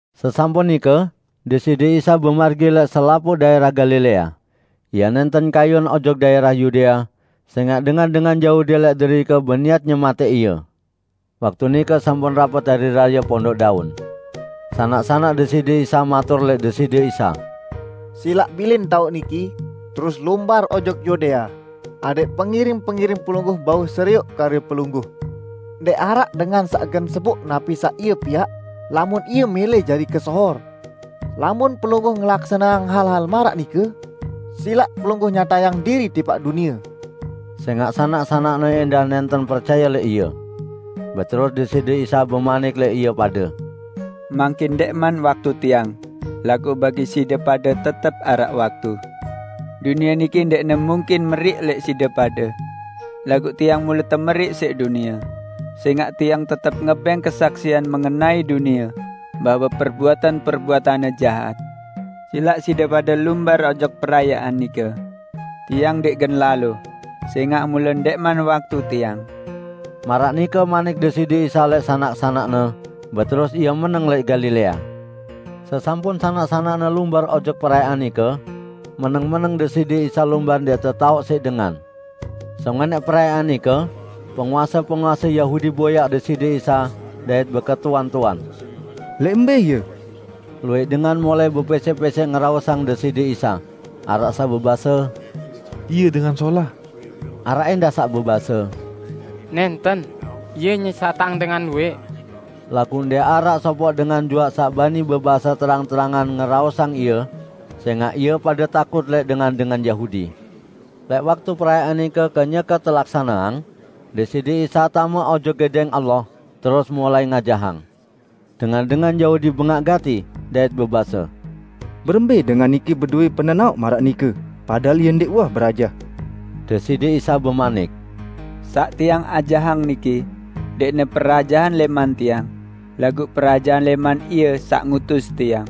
Sesampun nike Deside Isa bemargi lẽq selapuq daẽrah Galilea. Ie nẽnten kayun ojok daẽrah Yudea, sẽngaq dengan-dengan Yahudi lẽq derike beniat nyematẽq Ie. Waktu nike sampun rapet Hari Raye Pondok Daun. Sanak-sanak Deside Isa matur lẽq Deside Isa, "Silaq bilin taoq niki, terus lumbar ojok Yudea, adẽq pengiring-pengiring Pelungguh bau serioq karye Pelungguh. Ndẽq araq dengan saq gen seboq napi saq ie piaq, lamun ie mẽlẽ jari kesohor. Lamun Pelungguh ngelaksaneang hal-hal maraq nike, silaq Pelungguh nyatayang diriq tipaq dunie!" ( Sẽngaq sanak-sanak-Ne ẽndah nẽnten percaye lẽq Ie.) Beterus Deside Isa bemanik lẽq ie pade, "Mangkin ndẽqman waktu Tiang, laguq bagi side pade tetep araq waktu. Dunie niki ndẽqne mungkin meriq lẽq side pade. Laguq Tiang mule temeriq siq dunie, sẽngaq Tiang tetep ngebẽng kesaksian mengenai dunie bahwe perbuatan-perbuatanne jahat. Silaq side pade lumbar ojok perayaan nike. Tiang ndẽq gen lalo, sẽngaq mule ndẽqman waktu Tiang." Maraq nike manik Deside Isa lẽq sanak-sanak-Ne, beterus Ie meneng lẽq Galilea. Sesampun sanak-sanak-Ne lumbar ojok perayaan nike, meneng-meneng Deside Isa lumbar ndẽq tetaoq siq dengan. Sengonẽq perayaan nike, penguase-penguase Yahudi boyaq Deside Isa dait beketuan-tuan, "Lẽq mbẽ Ie?" Luwẽq dengan mulai bepẽsẽq-pẽsẽq ngeraosang Deside Isa. Araq saq bebase, "Ie dengan solah." Araq ẽndah saq bebase, "Nẽnten! Ie nyesatang dengan luwẽq." Laguq ndẽq araq sopoq dengan juaq saq bani bebase terang-terangan ngeraosang Ie, sẽngaq ie pade takut lẽq dengan-dengan Yahudi. Lẽq waktu perayaan nike kenyeke telaksaneang, Deside Isa tame ojok Gedẽng Allah, terus mulai ngajahang. Dengan-dengan Yahudi bengaq gati, dait bebase, "Berembẽ dengan niki bedowẽ penenaoq maraq nike, padahal Ie ndẽq uwah berajah?" Deside Isa bemanik, "Saq Tiang ajahang niki, ndẽqne perajahan lẽman Tiang, laguq perajahan lẽman Ie saq ngutus Tiang.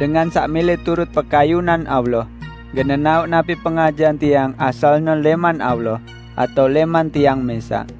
Dengan saq mẽlẽ turut pekayunan Allah gen nenaoq napi pengajahan Tiang asalne lẽman Allah atao lẽman Tiang mẽsaq.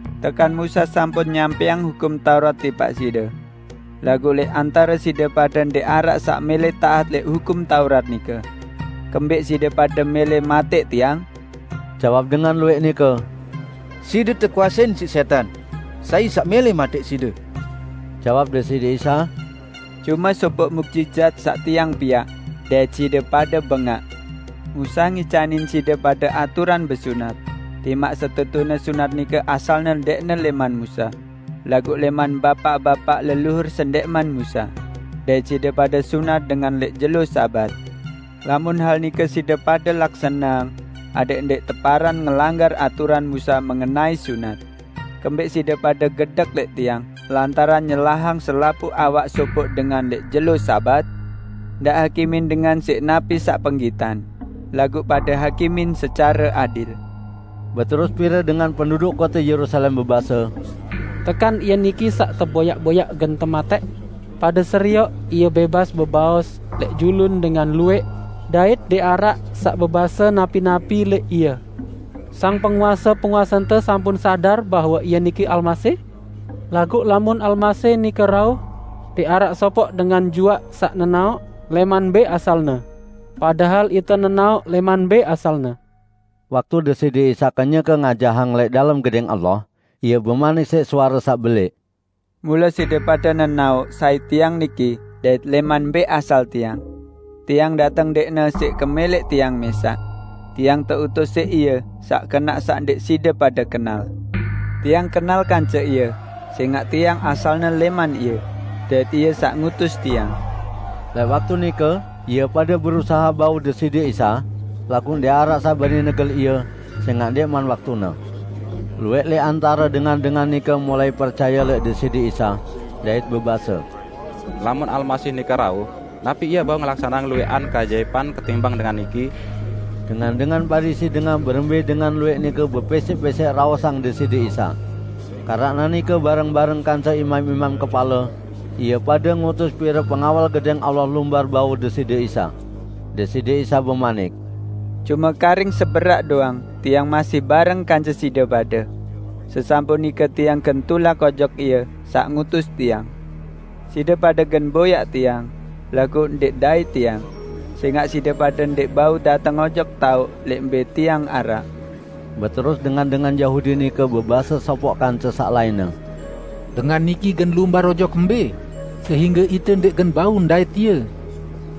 Tekan Musa sampun nyampẽang Hukum Taurat tipaq side. Laguq lẽq antare side pade ndẽq araq saq mẽlẽ taat lẽq Hukum Taurat nike. Kembẽq side pade mẽlẽ matẽq Tiang?" Jawab dengan luwẽq nike, "Side siq tekuasein siq sẽtan! Sai saq mẽlẽ matẽq Side?" Jawab Deside Isa, "Cume sopoq muqjizat saq Tiang piaq, dait side pade bengaq. Musa ngicanin side pade aturan besunat -- timaq setetune sunat nike asalne ndẽqne lẽman Musa, laguq lẽman bapaq-bapaq leluhur sendẽqman Musa -- dait side pade sunat dengan lẽq jelo Sabat. Lamun hal nike side pade laksaneang adẽq ndẽq teparan ngelanggar aturan Musa mengenai sunat, kembẽq side pade gedek lẽq Tiang lantaran nyelahang selapuq awak sopoq dengan lẽq jelo Sabat? Ndaq hakimin dengan siq napi saq penggitan, laguq pade hakimin secare adil." Beterus pire dengan penduduk kote Yerusalem bebase, "Tekan Ie niki saq teboyaq-boyaq gen tematẽq? Pade serioq, Ie bẽbas bebaos lẽq julun dengan luwẽq, dait ndẽq araq saq bebase napi-napi lẽq Ie! Sang penguase-penguasente sampun sadar bahwe Ie niki Almasih? Laguq lamun Almasih nike rauh, ndẽq araq sopoq dengan juaq saq nenaoq lẽman mbẽ asal-Ne. Padahal ite nenaoq lẽman mbẽ asal-Ne." Waktu Deside Isa kenyeke ngajahang lẽq dalem Gedẽng Allah, Ie bemanik siq suare saq belẽq, "Mule side pade nenaoq sai Tiang niki dait lẽman mbẽ asal Tiang. Tiang dateng ndẽqne siq kemẽlẽq Tiang mẽsaq. Tiang teutus siq Ie saq kenaq saq ndẽq side pade kenal. Tiang kenal kance Ie sẽngaq Tiang asalne lẽman Ie, dait Ie saq ngutus Tiang." Lẽq waktu nike ie pade berusahe bau Deside Isa, laguq ndẽq araq saq bani negel Ie, sẽngaq ndẽqman waktune. Luwẽq lẽq antare dengan-dengan nike mulai percaye lẽq Deside Isa, dait bebase, "Lamun Almasih nike rauh, napi Ie bau ngelaksaneang luwẽqan keajaipan ketimbang Dengan niki?" Dengan-dengan Parisi dengah berembẽ dengan luwẽq nike bepẽsẽq-pẽsẽq raosang Deside Isa. Keranaq nike bareng-bareng kance imam-imam kepale, ie pade ngutus pire pengawal Gedẽng Allah lumbar bau Deside Isa. Deside Isa bemanik, "Cume karing seberaq doang Tiang masih bareng kance side pade. Sesampun nike Tiang gen tulak ojok Ie saq ngutus Tiang. Side pade gen boyaq Tiang, laguq ndẽq ndait Tiang; sẽngaq side pade ndẽq bau dateng ojok taoq lẽq mbẽ Tiang araq." Beterus dengan-dengan Yahudi nike bebase sopoq kance saq lainne, "Dengan niki gen lumbar ojok mbẽ, sehingge ite ndẽq gen bau ndait Ie?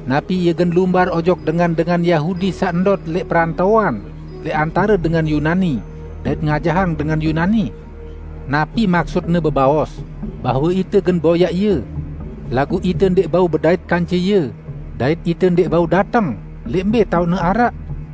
Napi Ie gen lumbar ojok dengan-dengan Yahudi saq ndot lẽq perantoan lẽq antare dengan Yunani, dait ngajahang dengan Yunani? Napi maksut-Ne bebaos bahwe ite gen boyaq Ie laguq ite ndẽq bau bedait kance Ie dait ite ndẽq bau dateng lẽq mbẽ taoq-Ne araq?"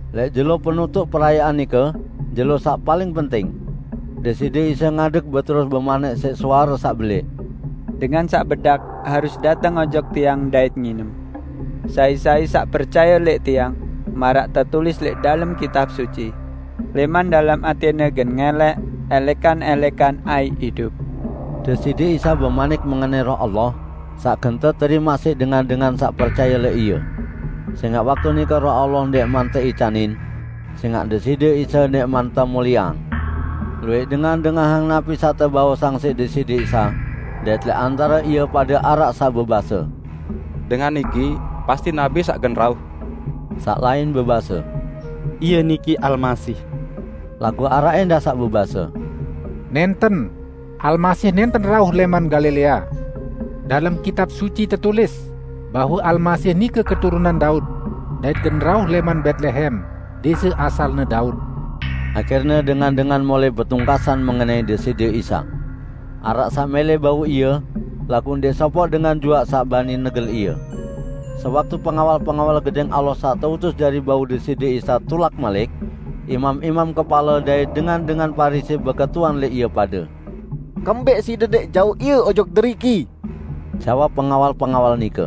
Lẽq jelo penutuq perayaan nike, jelo saq paling penting, Deside Isa ngadeg beterus bemanik siq suare saq belẽq, "Dengan saq bedak, harus dateng ojok Tiang dait nginem! Sai-sai saq percaye lẽq Tiang, maraq tetulis lẽq dalem Kitab Suci: 'Lẽman dalem atẽne gen ngẽlẽk ẽlẽkan-ẽlẽkan aiq idup.' " ( Deside Isa bemanik mengenai Roh Allah, saq gen teterimaq siq dengan-dengan saq percaye lẽq Ie. Sẽngaq waktu nike Roh Allah ndẽqman teicanin; sẽngaq Deside Isa ndẽqman temulieang.) Luwẽq dengan dengahang napi saq tebaosang siq Deside Isa, dait lẽq antare ie pade araq saq bebase, "Dengan niki pasti Nabi saq gen rauh!" Saq lain bebase, "Ie niki Almasih!" Laguq araq ẽndah saq bebase, "Nẽnten, Almasih nẽnten rauh lẽman Galilea! Dalem Kitab Suci tetulis bahwe Almasih nike keturunan Daud dait gen rauh lẽman Betlehem, dẽse asalne Daud." Ahirne dengan-dengan mulai betungkasan mengenai Deside Isa. Araq saq mẽlẽ bau Ie, laguq ndẽq sopoq dengan juaq saq bani negel Ie. Sewaktu pengawal-pengawal Gedẽng Allah saq teutus jari bau Deside Isa tulak malik, imam-imam kepale dait dengan-dengan Parisi beketuan lẽq ie pade, "Kembẽq side ndẽq jauq Ie ojok deriki?" Jawab pengawal-pengawal nike,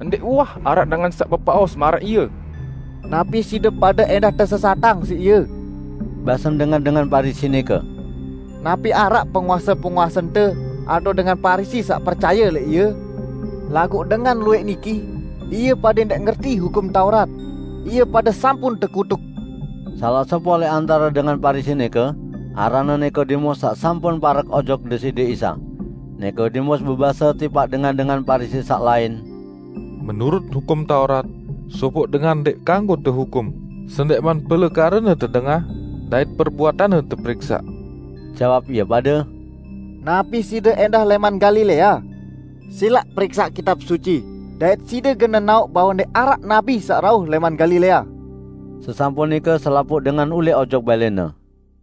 "Ndẽq uwah araq dengan saq bebaos maraq Ie!" "Napi side pade ẽndah tesesatang siq Ie?" basen dengan-dengan Parisi nike. "Napi araq penguase-penguasente atao dengan Parisi saq percaye lẽq Ie? Laguq dengan luwẽq niki, ie pade ndẽq ngerti Hukum Taurat, ie pade sampun tekutuk." Salaq sopoq lẽq antare dengan Parisi nike, aranne Nikodemus saq sampun parek ojok Deside Isa. Nikodemus bebase tipaq dengan-dengan Parisi saq lain, "Menurut Hukum Taurat, sopoq dengan ndẽq kanggo tehukum sendẽqman pelekarene tedengah dait perbuatanne teperiksaq." Jawab ie pade, "Napi side ẽndah lẽman Galilea? Silaq periksaq Kitab Suci dait side gen nenaoq bahwe ndẽq araq nabi saq rauh lẽman Galilea!" [ Sesampun nike selapuq dengan ulẽq ojok balẽne.